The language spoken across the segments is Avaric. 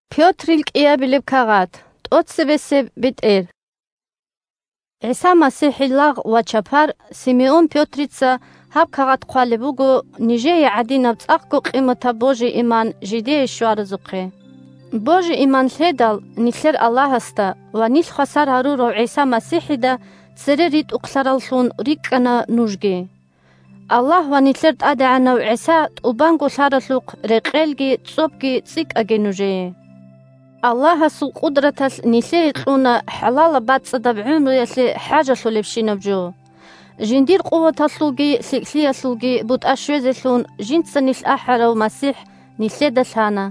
бетӀер Саламалъул рагӀабиги дугӀаги 1ГӀиса МасихӀил лагъ ва чапар Симеон Пётрица гьаб кагъат хъвалеб буго нижее гӀадинаб цӀакъго къиматаб божи-иман жидее щваразухъе. Божи-иман лъедал, нилъер Аллагьасда ва нилъ хвасар гьарурав ГӀиса МасихӀида цере ритӀухълъараллъун рикӀкӀана нужги. Аллагь ва нилъер ТӀадегӀанав ГӀиса тӀубанго лъаралъухъ рекъелги цӀобги цӀикӀкӀаги нужее! Аллагьасул къудраталъ нилъее кьуна хӀалалаб-бацӀцӀадаб гӀумруялъе хӀажалъулебщинаб жо. Жиндир къуваталъулги лъикӀлъиялъулги бутӀа щвезелъун жинца нилъ ахӀарав МасихӀ нилъеда лъана.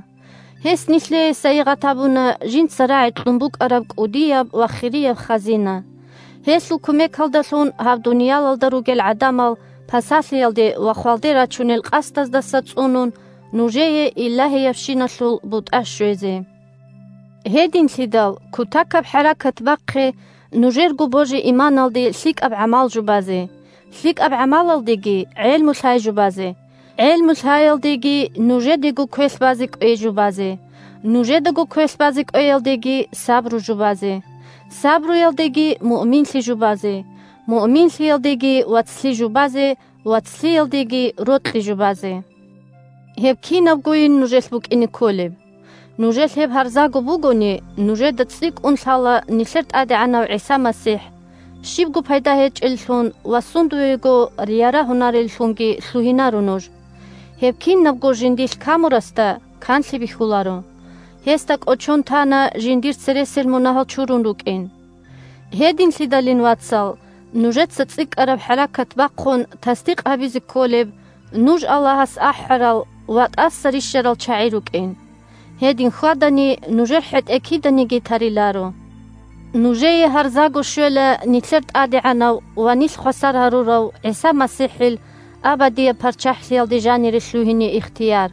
Гьес нилъее сайигъат гьабуна жинца рагӀи кьун букӀараб кӀудияб ва хирияб хазина, – гьелъул кумекалдалъун гьаб дуниялалда ругел гӀадамал пасалъиялде ва хвалде рачунел къасдаздаса цӀунун, нужее илагьиябщиналъул бутӀа щвезе. Гьединлъидал кутакаб хӀаракат бахъе нужерго божи-иманалде лъикӀаб гӀамал жубазе, лъикӀаб гӀамалалдеги гӀелму-лъай жубазе, гӀелму-лъаялдеги нужедаго квелъ базе кӀвей жубазе, нужедаго квелъ базе кӀвеялдеги сабру жубазе, сабруялдеги муъминлъи жубазе, муъминлъиялдеги вацлъи жубазе, вацлъиялдеги рокьи жубазе. Гьеб кинабгойин нужелъ букӀине кколеб! Нужелъ гьеб гьарзаго бугони, нужеда цӀикӀкӀун лъала нилъер ТӀадегӀанав ГӀиса МасихӀ, щибго пайда гьечӀеллъун ва сундуего ярагьунареллъунги лъугьинаро нуж. Гьеб кинабго жиндилъ камурасда канлъи бихьуларо: гьесда кӀочон тана жиндир цересел мунагьал чурун рукӀин. Гьединлъидалин, вацал, нужеца цӀикӀкӀараб хӀаракат бахъун тасдикъ гьабизе кколеб нуж Аллагьас ахӀарал ва тӀаса рищарал чагӀи рукӀин. Гьедин хьвадани – нужер хӀетӀе киданиги тариларо! Нужее гьарзаго щвела нилъер ТӀадегӀанав ва нилъ хвасар гьарурав ГӀиса МасихӀил абадияб ПарччахӀлъиялде жанире лъугьине ихтияр.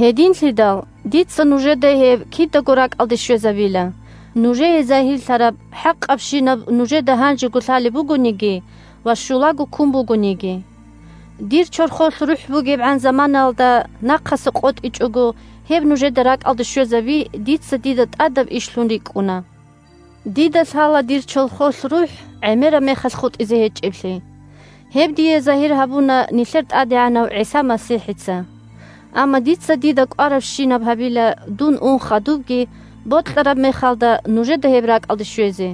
Гьединлъидал дица нужеда гьеб кидаго ракӀалде щвезабила, – нужее загьирлъараб хӀакъабщинаб нужеда гьанжего лъалеб бугониги ва щулаго ккун бугониги. Дир чорхолъ рухӀ бугебгӀан заманаялда нахъаса къотӀичӀого гьеб нужеда ракӀалде щвезаби дица дида тӀадаб ишлъун рикӀкӀуна. Дида лъала дир чорхолъ рухӀ гӀемераб мехалъ хутӀизе гьечӀеблъи. Гьеб дие загьир гьабуна нилъер ТӀадегӀанав ГӀиса МасихӀица. Амма дица дида кӀварабщинаб гьабила, – дун ун хадубги, бокьараб мехалда нужеда гьеб ракӀалде щвезе.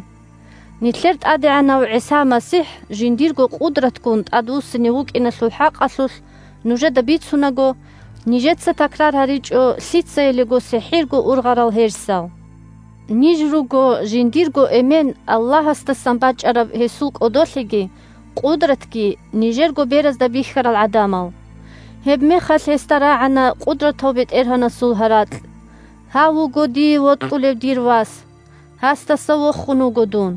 Нилъер ТӀадегӀанав ГӀиса МасихӀ жиндирго къудратгун тӀадвуссине вукӀиналъул хӀакъалъулъ нужеда бицунаго, нижеца такрар гьаричӀо лъицаялиго сихӀирго ургъарал гьерсал. Ниж руго жиндирго Эмен – Аллагьасдасан бачӀараб гьесул кӀодолъиги къудратги нижерго беразда бихьарал гӀадамал. Гьеб мехалъ гьесда рагӀана Къудратав БетӀергьанасул гьаракь: «Гьав вуго Дие вокьулев Дир Вас. Гьасдаса вохун вуго Дун».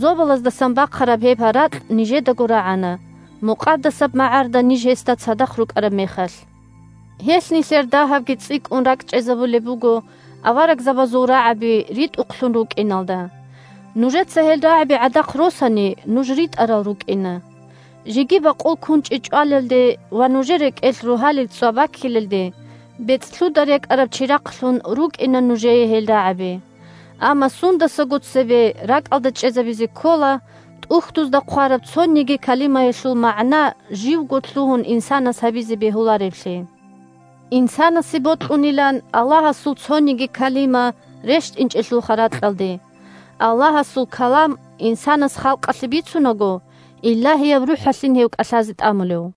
Зобалаздасан бахъараб гьеб гьаракь нижедаго рагӀана, мукъадасаб магӀарда ниж гьесда цадахъ рукӀараб мехалъ. Гьелъ нилъер дагьабги цӀикӀкӀун ракӀчӀезабулеб буго аварагзабазул рагӀаби ритӀухълъун рукӀиналда. Нужеца гьел рагӀаби гӀадахъ росани, нуж ритӀарал рукӀина. Жеги бакъул кунчӀи чӀвалелде ва нужер рекӀелъ Рогьалил ЦӀва баккилелде, бецӀлъуда рекӀараб чирахълъун рукӀина нужее гьел рагӀаби. Амма сундасаго цебе ракӀалда чӀезабизе ккола ТӀухьдузда хъвараб цониги калимаялъул магӀна живго лъугьун инсанас гьабизе бегьулареблъи. Инсанасе бокьунилан Аллагьасул цониги калима рещтӀинчӀелъулха ракьалде. Аллагьасул калам инсанас халкъалъе бицунаго, Илагьияб РухӀалъин гьев кӀалъазе тӀамулев.